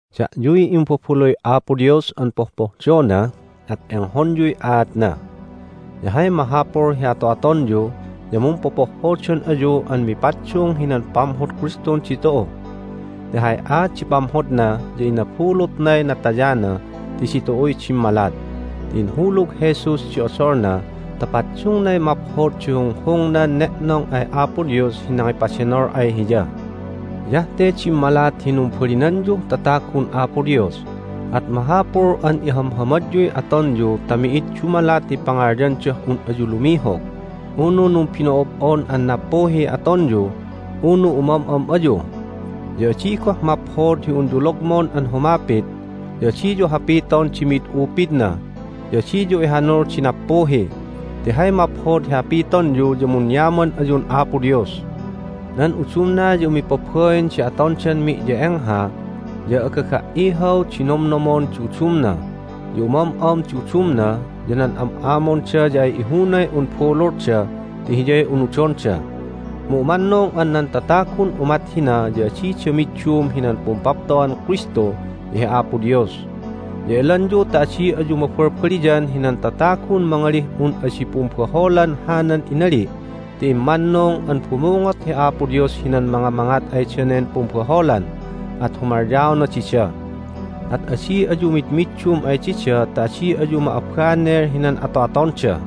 Da'yuy imbabaluy Apo Dios an pohpohdona, at enghonyuy aatna. Ya hay mahapul hi ato'atonyu ya mumpopohhodan ayu an mipaddung hinan pamhod Kristun ditu'u. Ti hay aat di pamhodna ya inabulutnay natayana ti ditu'uy dimmalat, ti inhulug Jesus di odolna ta paddungnay maphod di hunghungnan ne'nong ay Apo Dios hi nangipadenol ay Hiya. Hiyah te dimmalat hi numbalinanyuh tatagun Apo Dios, at mahapul an ihamhamadyuy atonyu ta mi'id dumalat hi pangalyandah un ayu lumihog, unu numbino'ob'on an nappuhiy atonyu, unu umam'am ayu. Ya adi goh maphod hi unyu logmon an humapit, ya adiyu hapiton di mi'id upidna, ya adiyu ihanul di nappuhi. Ti hay maphod hi hapitonyu ya munyaman ayun Apo Dios. Nan udumna ya umipabain di atondan mi'ye'engha, ya agaga"ihaw di nomnomon di udumna. Ya umam'am di udumna, ya nan am'amonda ya ay ihunay un bululda ti hiyay unudonda. Mu umannung an nan tatagun umat hina ya adida middum hinan pumpapto'an Kristu ya hi Apo Dios. Ya elanyu ta adi ayu mabalbaliyan hinan tatagun mangalih un adi pumbaholan hanan inali' ti immannung an bumungot hi Apo Dios hinan mangamangat ay danen pumbaholan, at humalyaona dida. At adi ayu midmiddum ay dida ta adi ayu ma'abanel hinan ato'atonda.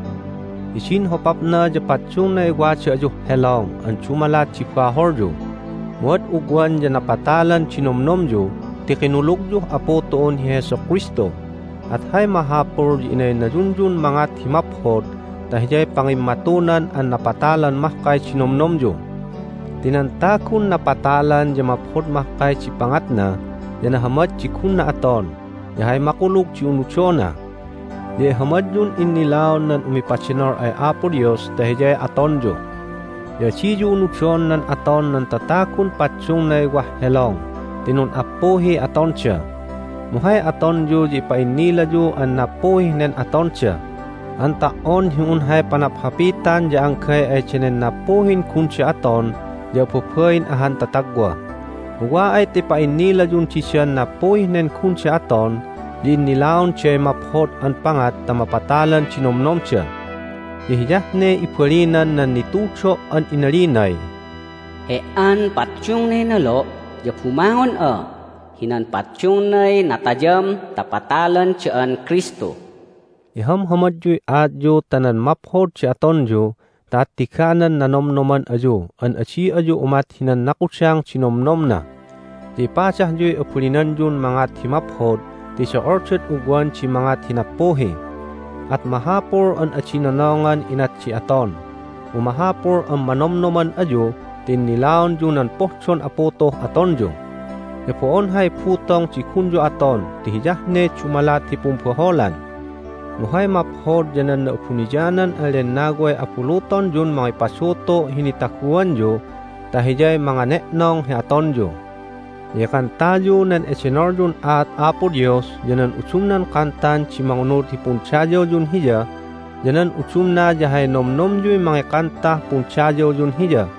Hidin hopapna ya paddungnay wada ayuh helong an dumalat di baholyu, mu ad ugwan ya napatalan di nomnomyu ti kinulugyuh Apu tu'un hi Jesu Kristu, at hay mahapul ya inaynayunyun mangat hi maphod ta hiyay pangimmatunan an napatalan mahkay di nomnomyu. Ti nan tagun napatalan ya maphod mahkay di pangatna, ya nahamad di gunna aton, ya hay makulug di unudona. Ya ihamadyun innilaon nan umipadenol ay Apo Dios ta hiyay atonyu. Ya adiyu unudon nan aton nan tatagun paddungnay wah helong ti nun'appuhiy atonda. Mu hay atonyu ya ipa'innilayu an nappuhih nen atonda an ta"on hi un hay panaphapitan ya anggay ay danen nappuhin gunda aton ya ababain ahan tatagwa. Mu wa ay ta ipa'innilayun didan nappuhih nen gunda aton ya innilaonday maphod an pangat ta mapatalan di nomnomda. Ya hiyah ne ibalinan nan nitudo' an inalinay, "He"an paddungnay nolo' ya bumangon'a hinan paddungnay natayam ta patalan da'an Kristu." Ihamhamadyuy aatyu ta nan maphod di atonyu ta attiganan nanomnoman ayu an adi ayu umat hinan nakudang di nomnomna. Ya ipadahyuy abalinanyun mangat hi maphod ti do'oldad ugwan di mangat hi nappuhi. At mahapul an adi nonongan inat di aton, mu mahapul an manomnoman ayu ta innilaonyu nan pohdon Apu tu'uh atonyu. Ya bo'on hay butong di gunyu aton ti hiyah ne dumalat hi pumbaholan. Mu hay maphod ya nan Na'abuniyanan an Lennaway abulutonyun mangipadutu' hi nitaguanyu ta Hiyay mangane'nong hi atonyu. Ya ikantayu nan edenolyun aat Apo Dios ya nan udumnan kantan di mangunud hi pundayawyun Hiya, ya nan udumna ya hay nomnomyuy mangikantah pundayawyun Hiya.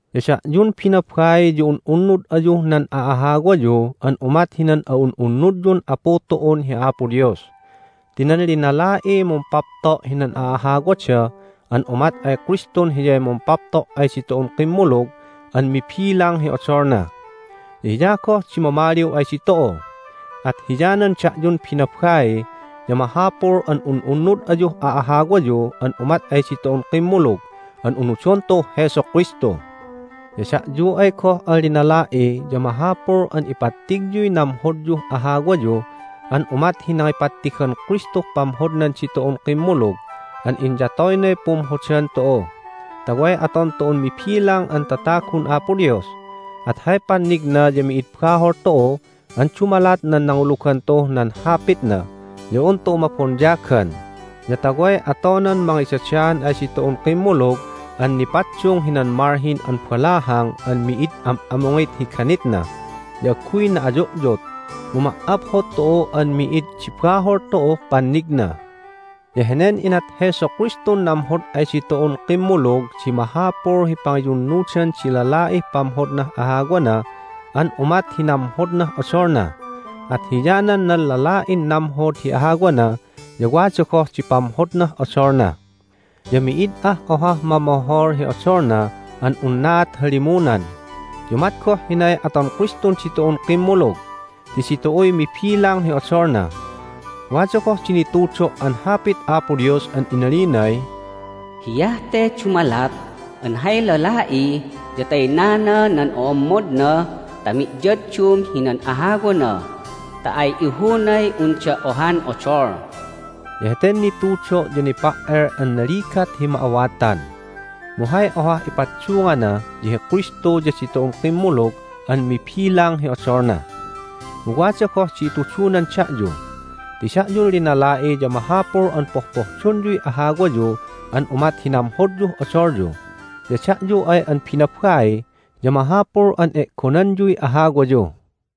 Ya da'yun binabai ya un'unnud ayuh nan a'ahawayu an umat hinan a'un'unnudyun Apu tu'un hi Apo Dios. Ti nan linala'iy mumpapto' hinan a'ahawada an umat ay Kristun Hiyay mumpapto' ay ditu'un kimmulug an mibilang hi odolna. Ya Hiya goh di mamaliw ay ditu'u. At hiyanan da'yun binabai ya mahapul an un'unnud ayuh a'ahawayu an umat ay ditu'un kimmulug an unudon tu'uh Jesu Kristu. Ya da'yu ay goh an linala'i ya mahapul an ipattigyuy namhodyuh ahawayu an umat hi nangipattigan Kristuh pamhodnan ditu'un kimmulug an inyatoynay pumhodan tu'u ta way aton tu'un mibilang an tatagun Apo Dios, at hay pannigna ya mi'id bahol tu'u an dumalat nan nangulugan tu'uh nan Hapitna ya un tu'u mabonyagan, ya ta way atonan mangidadaan ay ditu'un kimmulug an nipaddung hinan malhin an balahang an mi'id am'amungit hi ganitna, ya agguy na'ayu'yut, mu ma"aphod tu'u an mi'id di bahol tu'uh pannigna. Ya henen inat Jesu Kristun namhod ay ditu'un kimmulug di mahapul hi pangiyunnudan di lala'ih pamhodnah ahawana an umat hi namhodnah odolna. At hiyanan nan lala'in namhod hi ahawana ya wada goh di pamhodnah odolna. Ya mi'id ah ohah mamohol hi odolna an unnaat halimunan. Ya umat goh hinay aton Kristun ditu'un kimmulug ti ditu'uy mibilang hi odolna. Wada goh di nitudo' an Hapit Apo Dios an inalinay, "Hiyah te dumalat an hay lala'i ya taynana nan o'ommodna ta miyaddum hinan ahawana ta ay ihunay unda ohan odol." Ya heten nitudo' ya nipa"el an naligat hi ma'awatan, mu hay ohah ipaddungana ya hi Kristu ya ditu'un kimmulug an mibilang hi odolna. Mu wada goh di itudunan da'yu: Ti da'yun linala'i ya mahapul an pohpohdonyuy ahawayu an umat hi namhodyuh odolyu, ya da'yu ay an binabai ya mahapul an e'gonanyuy ahawayu.